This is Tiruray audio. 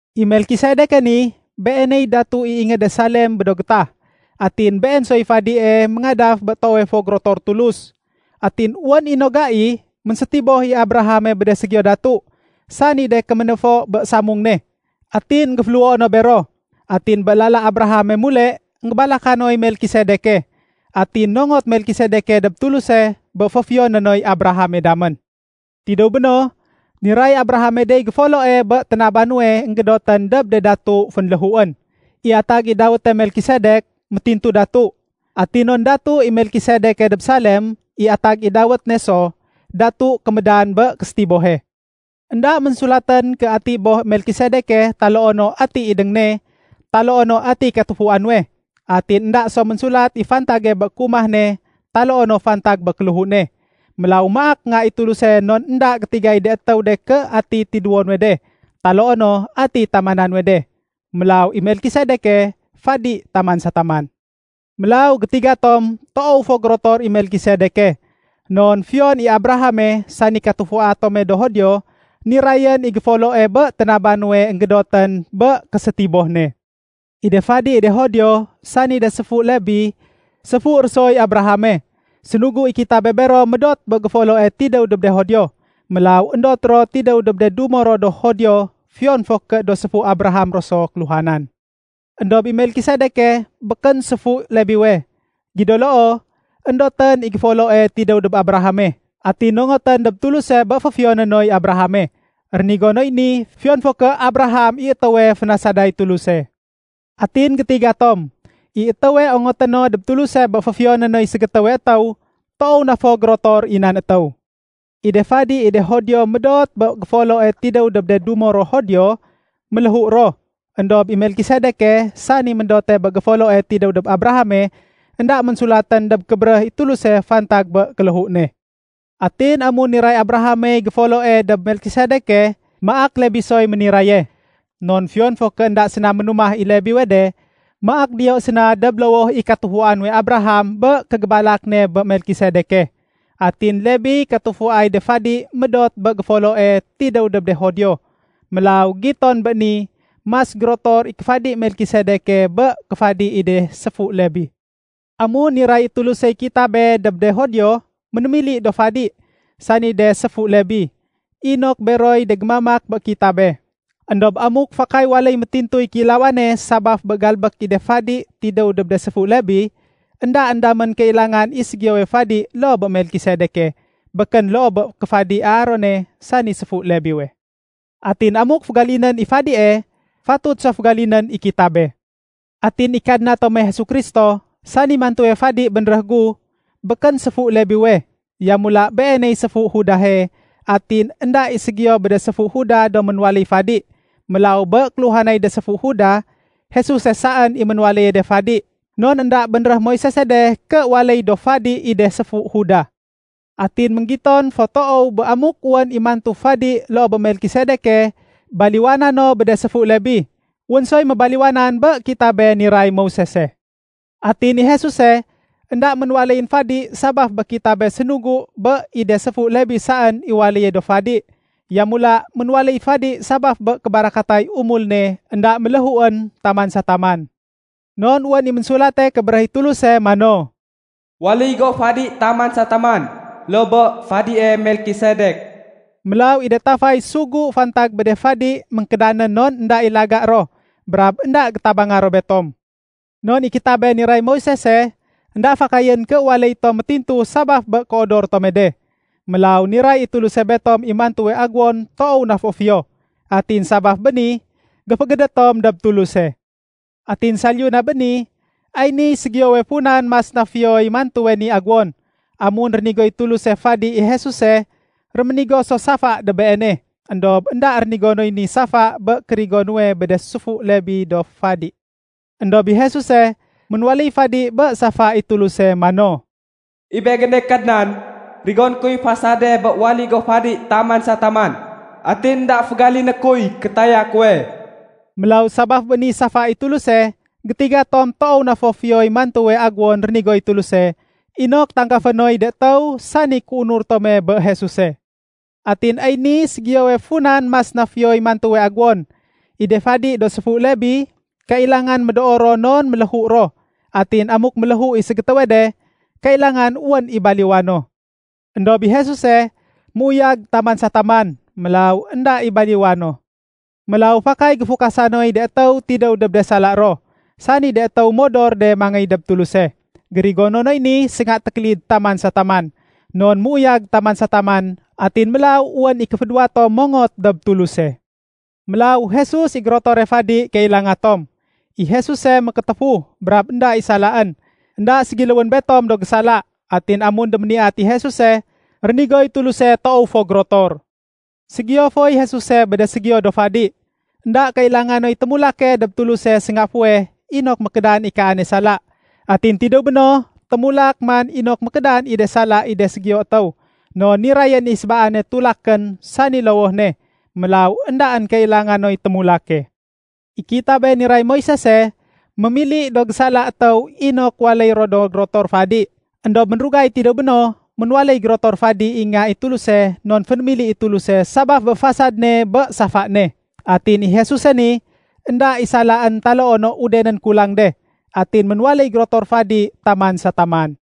I Melkisedeke ni, beeney datu i ingéde Salem bé do gétah. Atin been soy fadie méngadaf bé toowe fo gérotor Tulus. Atin wén i no gai, ménsétiboh i Abrahame bé de ségiyo datu, sani de kéménéfo bé samung ne, atin énggéféléhuo no bero. Atin bé lala Abrahame mule, énggébalaka noy Melkisedeke. Atin nongot Melkisedeke dob Tuluse, bé féfiyoné noy Abrahame damén. Tidéw béno, niray Abrahame dey géfoloe bé ténaba nuwe énggédotén dob de datu fénléhuén. I atag i dawéte Melkisedek, “Métintu Datu”. Atin non datu i Melkisedeke dob Salem, i atag i dawét ne so, “Datu Kémédan bé Késétibohe”. Enda ménsulatén ké ati boh Melkisedeke taloo no ati idéng ne taloo no ati katufua nuwe. Atin énda so ménsulat i fantage bé kéumah ne taloo no fantag bé kéléhu ne. Mélaw maak Nga i Tuluse non énda gétigay de étéw de ké ati tidéwo nuwe de taloo no ati ténamana nuwe de. Mélaw i Melkisedeke fadi taman sa taman. Mélaw gétiga tom toow fo gérotor i Melkisedeke. Non fiyon i Abrahame sani katufua tome do Judio, nirayén i géfoloe bé ténaba nuwe énggédotén bé késétiboh ne. I de fadi i de Judio, sani de séfu Lébi, séfu ro soy Abrahame. Sénugu i kitabe bero médot bé géfoloe tidéw dob de Judio. Mélaw éndot ro tidéw dob de dumo ro do Judio, fiyon fo ké do séfu Abraham ro so kéluhanan. Endob i Melkisedeke békén séfu Lebiwe. Gido loo, éndotén i géfoloe tidéw dob Abrahame, atin nongotén dob Tuluse bé féfiyoné noy Abrahame. Rénigo noy ni, fiyon fo ké Abraham i étéwe fénasaday Tuluse. Atin gétiga tom, i étéwe ongoté no dob Tuluse bé féfiyoné noy ségétéwe étéw, toow na fo gérotor i nan étéw. I de fadi i de Judio médot bé géfoloe tidéw dob de dumo ro Judio, méléhu ro. Endob i Melkisedeke, sani méndote bé géfoloe tidéw dob Abrahame, énda ménsulatén dob kébéréh i Tuluse fantag bé kéléhu ne. Atin amun niray Abrahamey géfoloe dob Melkisedeke, maak Lebi soy méniraye. Non fiyon fo ké énda séna ménumah i Lebiwe de, maak diyo séna dob lowoh i katufua nuwe Abraham bé kégébalak ne bé Melkisedeke. Atin Lebiy katufuay de fadi médot bé géfoloe tidéw dob de Judio. Mélaw giton bé ni, mas gérotor i kéfadi Melkisedeke bé kéfadi i de séfu Lebi. Amun niray i Tulusey kitabe dob de Judio, ménémili do fadi, sani de séfu Lebi, inok beroy de gémamak bé kitabe. Endob amuk fakay waléy métintuy kéilawane sabaf bé galbék i de fadi tidéw dob de séfu Lebi, éndaén damén kailangan i ségiyowe fadi loo bé Melkisedeke, békén loo bé kéfadi Aarone sani séfu Lebiwe. Atin amuk fégalinén i fadie, fatut so fégalinén i kitabe. Atin i Kadna tome Jesu Kristo, sani mantuwe fadi bénréh gu, békén séfu Lebiwe. Yamula, Beeney séfu Judahe, atin énda i ségiyo bé de séfu Judah do ménwaléy fadi. Mélaw bé kéluhanay de séfu Judah, Jesuse saén i ménwaléye de fadi. Non énda bénréh Moisese de ké waléy do fadi i de séfu Judah. Atin ménggiton fo toow bé amuk wén i mantu fadi loo bé Melkisedeke baliwana no bé de séfu Lebi, wén soy mébaliwanan bé kitabe niray Moisese. Atin i Jesuse énda ménwaléyén fadi sabaf bé kitabe sénugu bé i de séfu Lebi saén i waléye do fadi. Yamula ménwaléy fadi sabaf bé kébarakatay umul ne énda méléhuén taman sa taman. Non wén i Ménsulate Kébéréh i Tuluse mano, “Waléy go fadi taman sa taman, loo bé fadie Melkisedek.” Mélaw i de tafay sugu fantag bé de fadi ménkédanén non énda i laga ro brab énda gétabanga ro betom. Non i kitabe niray Moisese, énda fakayén ké waléy tom métintu sabaf bé kéodor tome de. Mélaw niray i Tuluse betom i mantuwe aguwon toow na fo fiyo. Atin sabaf bé ni, géfégédét tom dob Tuluse. Atin saliyu na bé ni, ay niy ségiyowe funan mas na fiyoy mantuwe ni agéwon. Amun rénigoy Tuluse fadi i Jesuse, réménigo so safa dob Beene. Endob énda rénigo noy ni safa bé kérigo nuwe bé de séfu Lebi do fadi. Endob i Jesuse, ménwaléy fadi bé safa i Tuluse mano, “I Begéne Kadnan, rigoné kuy fasade bé waléy go fadi taman sa taman. Atin énda fégaliné kuy kétaya kuwe.” Mélaw sabaf bé ni safa i Tuluse gétiga tom toow na fo fiyoy mantuwe aguwon rénigoy Tuluse inok tanggafé noy de étéw, sani kéunur tome bé Jesuse. Atin ay ni ségiyowe funan mas na fiyoy mantuwe agéwon. I de fadi do séfu Lebi, kailangan médoo ro non méléhu ro, atin amuk méléhu i ségétéwe de, kailangan wén i baliwa no. Endob i Jesuse, méuyag taman sa taman. Mélaw énda i baliwa no. Mélaw fakay géfukasa noy de étéw tidéw dob de sala ro, sani de étéw modor de mangéy dob Tuluse. Gérigono noy ni sénga tékélid taman sa taman. Non méuyag taman sa taman, atin mélaw wén i kéfédéwa tom mongot dob Tuluse. Mélaw Jesus i gérotore fadi kailanga tom. I Jesuse, mékétéfu brab énda i salaén. Enda ségiléwén betom do gésala. Atin amun déméniyat i Jesuse, rénigoy Tuluse toow fo gérotor. Ségiyo foy Jesuse bé de ségiyo do fadi. Enda kailanga noy témulake dob Tuluse sénga fuweh inok mékédan i kaane sala, atin tidéw béno témulak man inok mékédan i de sala i de ségiyo étéw. Non nirayén i sébaane tulakén, sani lowoh ne. Mélaw éndaén kailanga noy témulake. I kitabe niray Moisese, mémili do gésala étéw inok waléy ro do gérotor fadi. Endob ménrugay tidéw béno, ménwaléy gérotor fadi i Nga i Tuluse non fénémili i Tuluse sabaf bé fasad ne bé safa ne. Atin i Jesuse ni, énda i salaén taloo no udenén kulang de. Atin ménwaléy gérotor fadi taman sa taman.